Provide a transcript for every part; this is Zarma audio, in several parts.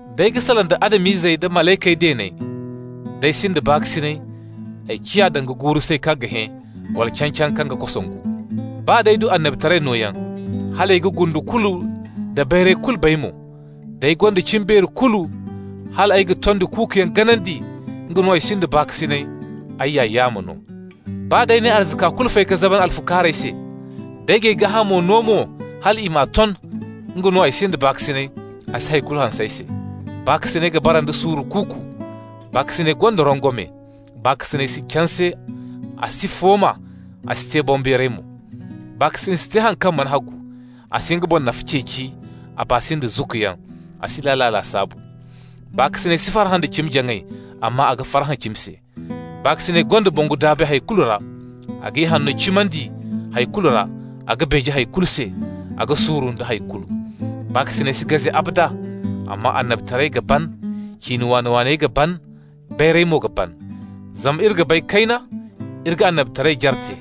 D'ay ga salaŋ da Adam-izey da malaykey deeney, day ay sinda baakasinay, ay ciya danga guuru-say kaŋ ga hẽ, wala can-caŋ kaŋ ga kosongu. Baa d'ay du annabitaray nooyaŋ, hal ay ga gundu kulu nda bayray kulu bay mo, d'ay gonda cimbeeri kulu hal ay ga tondi kuukuyaŋ ganandi, nga no ay sinda baakasinay, ay ya yaamo no. Baa d'ay n'ay arzaka kulu fay ka zaban alfukaarey se, d'ay g'ay gaahamo no mo hal i m'a ton, nga no ay sinda baakasinay, a si hay kulu hanse ay se. Baakasinay ga bara nda suuru kuuku, baakasinay gonda rongome. Baakasinay si canse. A si fooma, a si te boŋbeeray mo. Baakasinay si te haŋ kaŋ mana hagu, a si nga boŋ nafa ceeci, a baa si nda zukkuyaŋ, a si laala lasaabu. Baakasinay si farhã da cimi-jaŋay, amma a ga farhã cimi se. Baakasinay gonda bongu-daabay hay kulu ra, a ga ihanno cimandi hay kulu ra, a ga beeje hay kulu se, a ga suuru nda hay kulu. Baakasinay si gaze abada. Amma annabitarayey ga ban, ciine waani-waaney ga ban, bayray mo ga ban. Zama iri ga bay kayna, iri ga annabitaray jare te.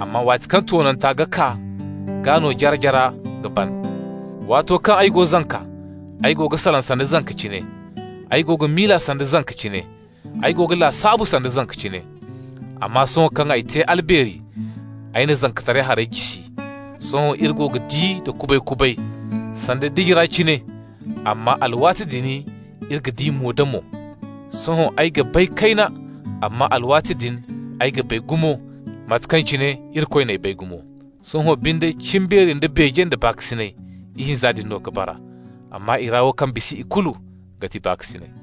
Amma waati kaŋ toonanta ga kaa, gaa no jare-jara ga ban. Waato kaŋ ay go zanka, ay go ga salaŋ sanda zanka cine, ay go ga miila sanda zanka cine, ay go ga lasaabu sanda zanka cine. Amma sohõ kaŋ ay te albeeri, ay na zankataray harey jisi. Sohõ iri go ga di da kubay-kubay sanda diji ra cine, amma alwaati din iri ga di mo-da-mo. Sohõ ay ga bay kayna, amma alwaati din ay ga bay gumo mate kaŋ cine Irikoy n'ay bay gumo. Sohõ binde cimbeeri da beeje da baakasinay, ihinza din no ka bara. Amma i ra wo kaŋ bisa ikulu ga ti baakasinay.